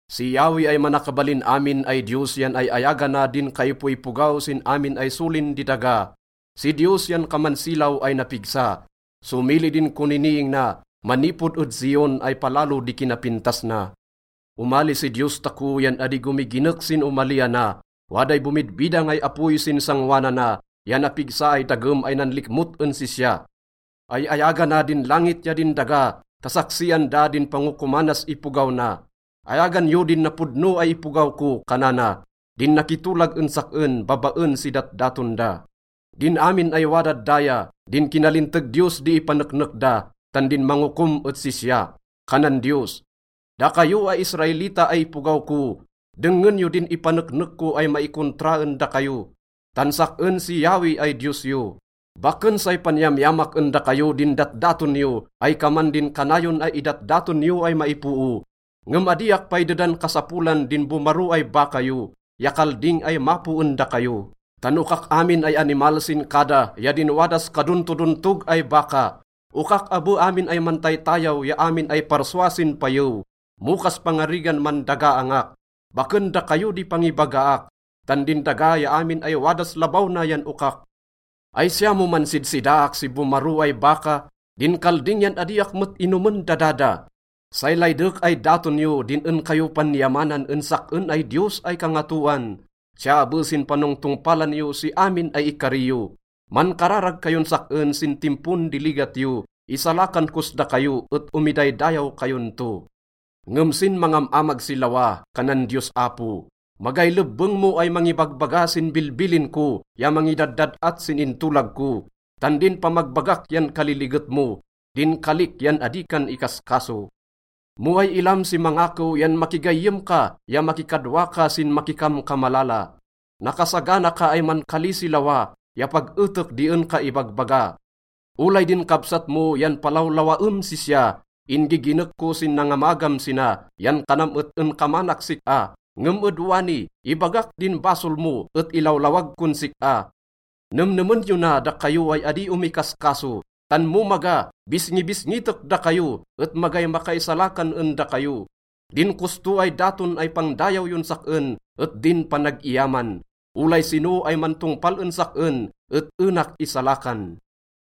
Si Yahweh ay Manakabalin Amin ay Diyos yan ay-ayagana din kaipoipogaw sin amin ay solin di daga. Si Diyos yan kaman silaw ay napigsa. Somili din koniniing na manipod ed Zion ay palalo di kinapintas na. Omali si Diyos tako yan adi gomiginek sin omaliana. Waday bomidbidang ay apoy sin sangoanana ya napigsa ay dagem ay nanlikmot en sisya. Ay-ayagana din langit ya din daga ta saksian da din pangokomanas ipogaw na. “Ayagan yo din napodno ay ipogaw ko,” kanana, “din nakitolag en sak-en babaen si datdaton da.” Din amin ay wadad daya, din kinalinteg Diyos di ipaneknek da, tan din mangokom et sisya. Kanan Diyos, “Dakayo ay Israelita ay ipogaw ko, dengngen yo din ipaneknek ko ay maikontra en dakayo, tan sak-en si Yahweh ay Diyos yo. Baken say panyamyamak en dakayo din datdaton yo ay kaman din kanayon ay idatdaton yo ay maipoo. Ngem adiak pay dedan kasapolan din bomaro ay baka yo ya kalding ay mapo en dakayo. Tan okak amin ay animal sin kada ya din wadas kadontodontog ay baka. Okak abe amin ay mantaytayaw ya amin ay parsua sin payew. Mo kaspangarigan mandagaangak, baken dakayo di pangibagaak, tan din daga ya amin ay wadas labaw na yan okak. Ay siya mo mansidsidaak si bomaro ay baka? Din kalding yan adiak met inomen dada da. Say laydek ay daton yo din en kayo pan-iyamanan en sak-en ay Diyos ay kangatoan, siya abe sin panongtongpalan yo si amin ay ikari yo. Mankararag kayon sak-en sin timpon di ligat yo, isalakan kos dakayo et omidaydayaw kayon to.” Ngem sin mangam-amag si lawa, kanan Diyos Apo, “Magay lebbeng mo ay mangibagbaga sin bilbilin ko ya mangidaddad-at sin intolag ko, tan din pamagbagak yan kaliliget mo, din kalik yan adi kan ikaskaso. Mo way ilam si mangakew yan makigayyem ka ya makikadwa ka sin makikamkamalala. Nakasagana ka ay mankali si lawa ya pag etek di en ka ibagbaga. Olay din kabsat mo yan palawlawaem sisya. In-giginek ko sin nangamagam sina yan kanam et en kamanak sik-a. Ngem ed wani, ibagak din basol mo et ilawlawag kon sik-a. Nemnemen yo na, dakayo ay adi omikaskaso, tan mo maga, bisngibisngitek dakayo et magay makaisalakan en dakayo. Din kosto ay daton ay pangdayaw yon sak-en et din panag-iyaman. Olay sino ay mantongpal en sak-en et enak isalakan.”